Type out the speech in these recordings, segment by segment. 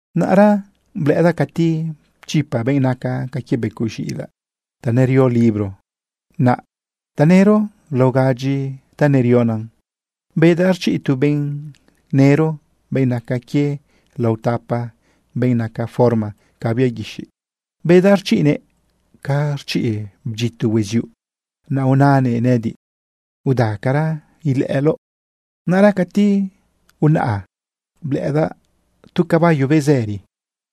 Naꞌra blëꞌëdaꞌ cati pchipa benꞌ naca ca quie becoꞌ z̃iꞌilaꞌ ta nerio libro naꞌ tanëro lao gadyi ta nerionan. Bedaꞌ rchiꞌ tu benꞌ nëro, benꞌ naca quie lao tapa benꞌ naca forma ca bia guixiꞌ. Bedaꞌ rchiꞌnëꞌ ca rchiꞌ bdyito hueziuꞌ. Naꞌ unanëꞌ nëꞌëdiꞌ: ―¡Udacara ilëꞌëloꞌ! Naꞌra cati unaꞌa blëꞌëdaꞌ tu caballo bezëri.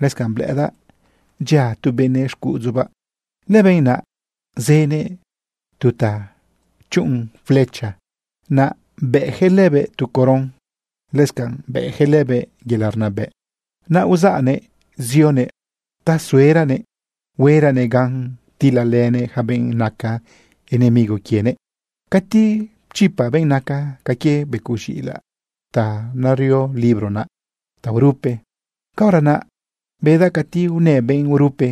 Lëscanꞌ blëꞌëdaꞌ dyia tu benëꞌ xcuꞌudzubaꞌ. Lëbenꞌ naꞌ zënëꞌ tu ta chuꞌun flecha. Naꞌ bëꞌjëꞌ lebëꞌ tu coron. Lëscanꞌ bëꞌjëꞌ lëbëꞌ yelaꞌ rnabëꞌ. Naꞌ uzaꞌnëꞌ zionëꞌ ta sueranëꞌ hueranëꞌ gan tilalënëꞌ yaca benꞌ naca enemigo quienëꞌ. Cati pchipa benꞌ naca ca quie becoꞌ z̃iꞌilaꞌ ta nerio libro naꞌ taurupe, caora naꞌ bedaꞌ cati unë benꞌ urupe,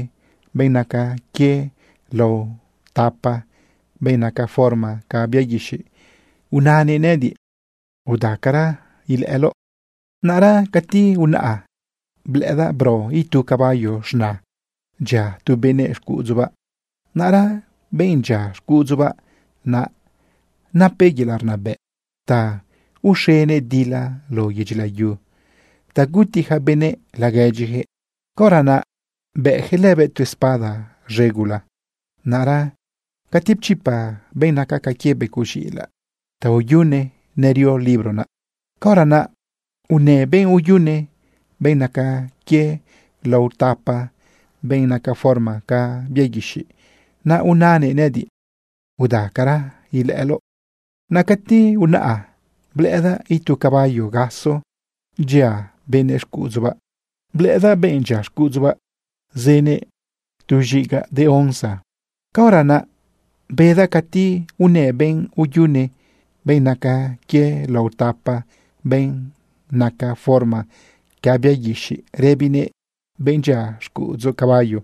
benꞌ naca quie lao tapa benꞌ naca forma ca bia guixiꞌ. Unanëꞌ nëꞌëdiꞌ: ―¡Udacara ilëꞌëloꞌ! Naꞌra cati unaꞌa blëꞌëdaꞌ bro itu caballo z̃na dyia tu benëꞌ xcuꞌudzubaꞌ. Naꞌra benꞌ dyia xcuꞌudzubaꞌ naꞌ, napëꞌ yelaꞌ rnabëꞌ ta uxenëꞌ dila lao yedyi layu ta guti ja benëꞌ laguedyijëꞌ. Caora naꞌ bëꞌjëꞌ lëbëꞌ tu espada z̃e gula. Naꞌra cati pchipa benꞌ naca ca quie becoꞌ z̃iꞌilaꞌ tauyune nerio libro naꞌ, caora naꞌ unë benꞌ uyune, benꞌ naca quie lao tapa benꞌ naca forma ca bia guixiꞌ. Naꞌ unanëꞌ nëꞌëdiꞌ: ―¡Udacara ilëꞌëloꞌ! Naꞌ cati unaꞌa blëꞌëdaꞌ itu caballo gaso dyia benëꞌ xcuꞌudzubaꞌ. Blëꞌëdaꞌ benꞌ dyia xcuꞌudzubaꞌ zënëꞌ tu z̃igaꞌ de onza. Caora naꞌ bedaꞌ cati unë benꞌ uyune, benꞌ naca quie lao tapa benꞌ naca forma ca bia guixiꞌ, rëbinëꞌ benꞌ dyia xcuꞌudzu caballo: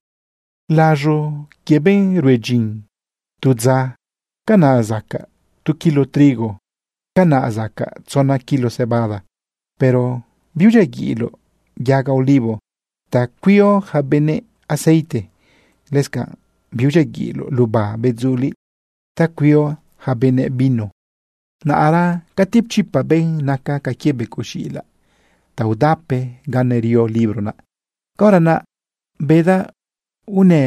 ―Laz̃o quie benꞌ rue dyin tu dza, canaꞌ sacaꞌ tu kilo trigo, canaꞌ sacaꞌ tzona kilo cebada. Pero biudyiaguiꞌloꞌ yaga olivo ta cuio ja benëꞌ aceite. Lëscanꞌ biudyiaguiꞌloꞌ luba bedzuliꞌ ta cuio ja benëꞌ vino. Naꞌra cati pchipa benꞌ naca ca quie becoꞌ z̃iꞌilaꞌ taudape ga nerio libro naꞌ, caora naꞌ bedaꞌ unë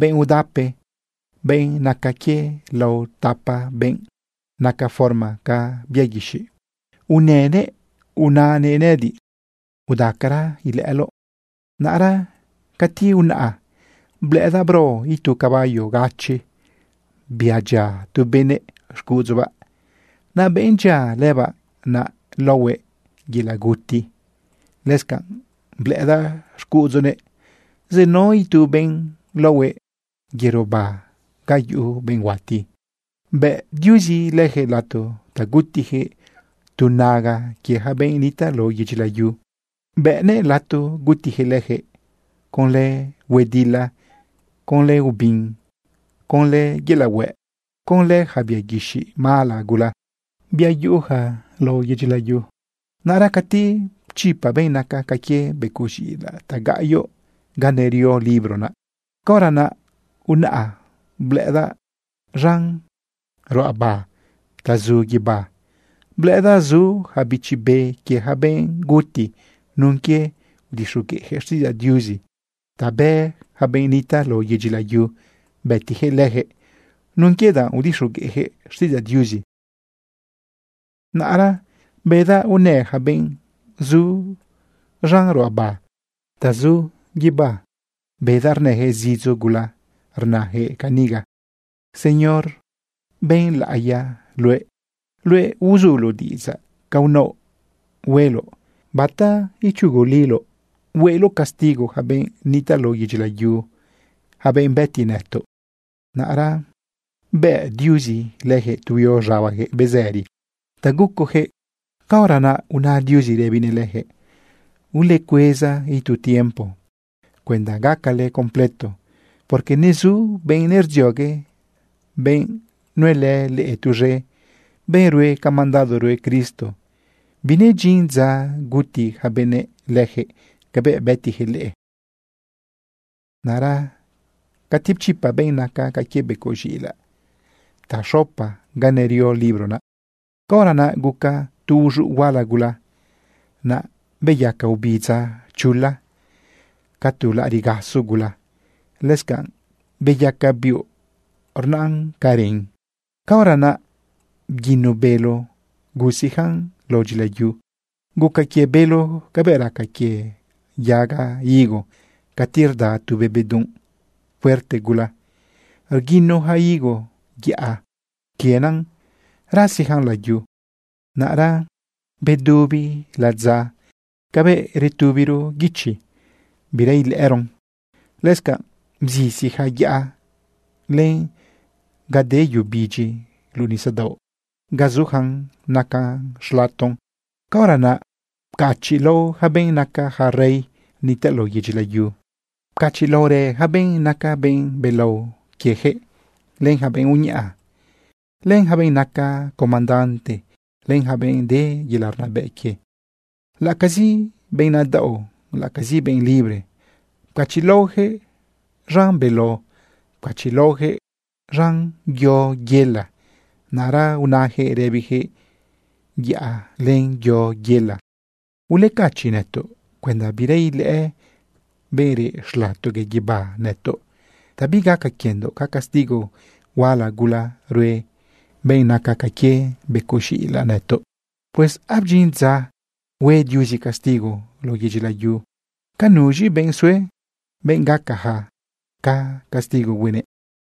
benꞌ udape, benꞌ naca quie lao tapa benꞌ naca forma ca bia guixiꞌ. Unënëꞌ unanëꞌ nëꞌëdiꞌ: ―¡Udacara ilëꞌëloꞌ! Naꞌra cati unaꞌa blëꞌëdaꞌ bro itu caballo gachi, bia dyia tu benëꞌ xcuꞌudzubaꞌ. Naꞌ benꞌ dyia lëbaꞌ naꞌ laohuëꞌ Yelaꞌ Guti. Lëscanꞌ blëꞌëdaꞌ xcuꞌudzunëꞌ zenao itu benꞌ laohuëꞌ Yero Ba Ga Yuꞌu Benꞌ Huati. Bëꞌ Diuzi lëjëꞌ lato ta gutijëꞌ tu naga quie ja benꞌ nitaꞌ lao yedyi layu. Bëꞌnëꞌ lato gutijëꞌ lëjëꞌ conlë huedila, conlë ubin, conlë yelaꞌ huëꞌ, conlë ja bia guixiꞌ mala gula, bia zu lao yedyi layu. Naꞌra cati pchipa benꞌ naca ca quie becoꞌ z̃iꞌilaꞌ tagaꞌyoꞌ ga nerio libro naꞌ, caora naꞌ unaꞌa blëꞌëdaꞌ z̃an ruꞌaba ta zu guibá, blëꞌëdaꞌ zu ja bichi be quie ja benꞌ guti nun quie udixogueꞌjëꞌ xtiꞌidzaꞌ Diuzi. Ta bë yaca benꞌ nitaꞌ lao yedyi layu bëtijëꞌ lëjëꞌ nun quie danꞌ udixogueꞌjëꞌ xtiꞌidzaꞌ Diuzi. Naꞌra bedaꞌ unë ja benꞌ zu z̃an ruꞌaba ta zu guibá, bedaꞌ rnëjëꞌ zidzo gula rnajëꞌ caniga: ―Señor, benꞌ laꞌiya luëꞌ. Luëꞌ uzuloꞌ diꞌidzaꞌ ca unaoꞌ hueloꞌ. ¿Bata ichuguliloꞌ hueloꞌ castigo ja benꞌ nitaꞌ lao yedyi layu, ja benꞌ bëti nëtoꞌ? Naꞌra bëꞌ Diuzi lëjëꞌ tu huio z̃abajëꞌ bezëri ta gucojëꞌ. Caora naꞌ una Diuzi rëbinëꞌ lëjëꞌ: ―Ulecueza itu tiempo cuenda gacale completo, porque nezu benꞌ nerdziogue, benꞌ nuelë leꞌe tuz̃e, benꞌ rue ca mandado rue Cristo. Binedyin dza guti ja benëꞌ lëjëꞌ cabëꞌ bëtijëꞌ leꞌe. Naꞌra cati pchipa benꞌ naca ca quie becoꞌ z̃iꞌilaꞌ taxopa ga nerio libro naꞌ, caora naꞌ guca tu uz̃uꞌ huala gula, naꞌ beyaca ubidza chula ca tu laꞌariꞌ gaso gula. Lëscanꞌ beyaca biuꞌ rnaꞌn ca ren. Caora naꞌ bguino bélo gusiꞌjan lao dyilayu. Guca quie bélo cabëꞌ raca quie yaga higo cati rda tu be bedunꞌ fuerte gula, rguino ja higo yaꞌa quienen rasiꞌjan layu. Naꞌra bedubi ladza cabëꞌ retubiro guichi, bira ilëꞌëron. Lëscanꞌ bzisi ja yaꞌa, len ga de yu bidyi luꞌu nisadaoꞌ ga zujan naca xlaton. Caora naꞌ pcachiꞌlao ja benꞌ naca ja rey nitaꞌ lao yedyi layu. Pcachiꞌlaorë ja benꞌ naca benꞌ belao quiejëꞌ, len ja benꞌ uñaꞌa, len ja benꞌ naca comandante, len ja benꞌ de yelaꞌ rnabëꞌ quie. Laꞌacazi benꞌ nadaꞌo, laꞌacazi benꞌ libre, pcachiꞌlaojëꞌ z̃an beló, pcachiꞌlaojëꞌ z̃an yo yela. Naꞌra unajëꞌ rëbijëꞌ yaꞌa len yo yela: ―Ulecachiꞌ nëtoꞌ cuenda bira ilëꞌë benꞌ reꞌ xlatogue guibá nëtoꞌ ta bigaca quiendoꞌ ca castigo huala gula rue benꞌ naca ca quie becoꞌ z̃iꞌilaꞌ nëtoꞌ. Pues abdyin dza hue Diuzi castigo lao yedyi layu. ¿Ca nuz̃i benꞌ sue, benꞌ gacaja ca castigo huenëꞌ?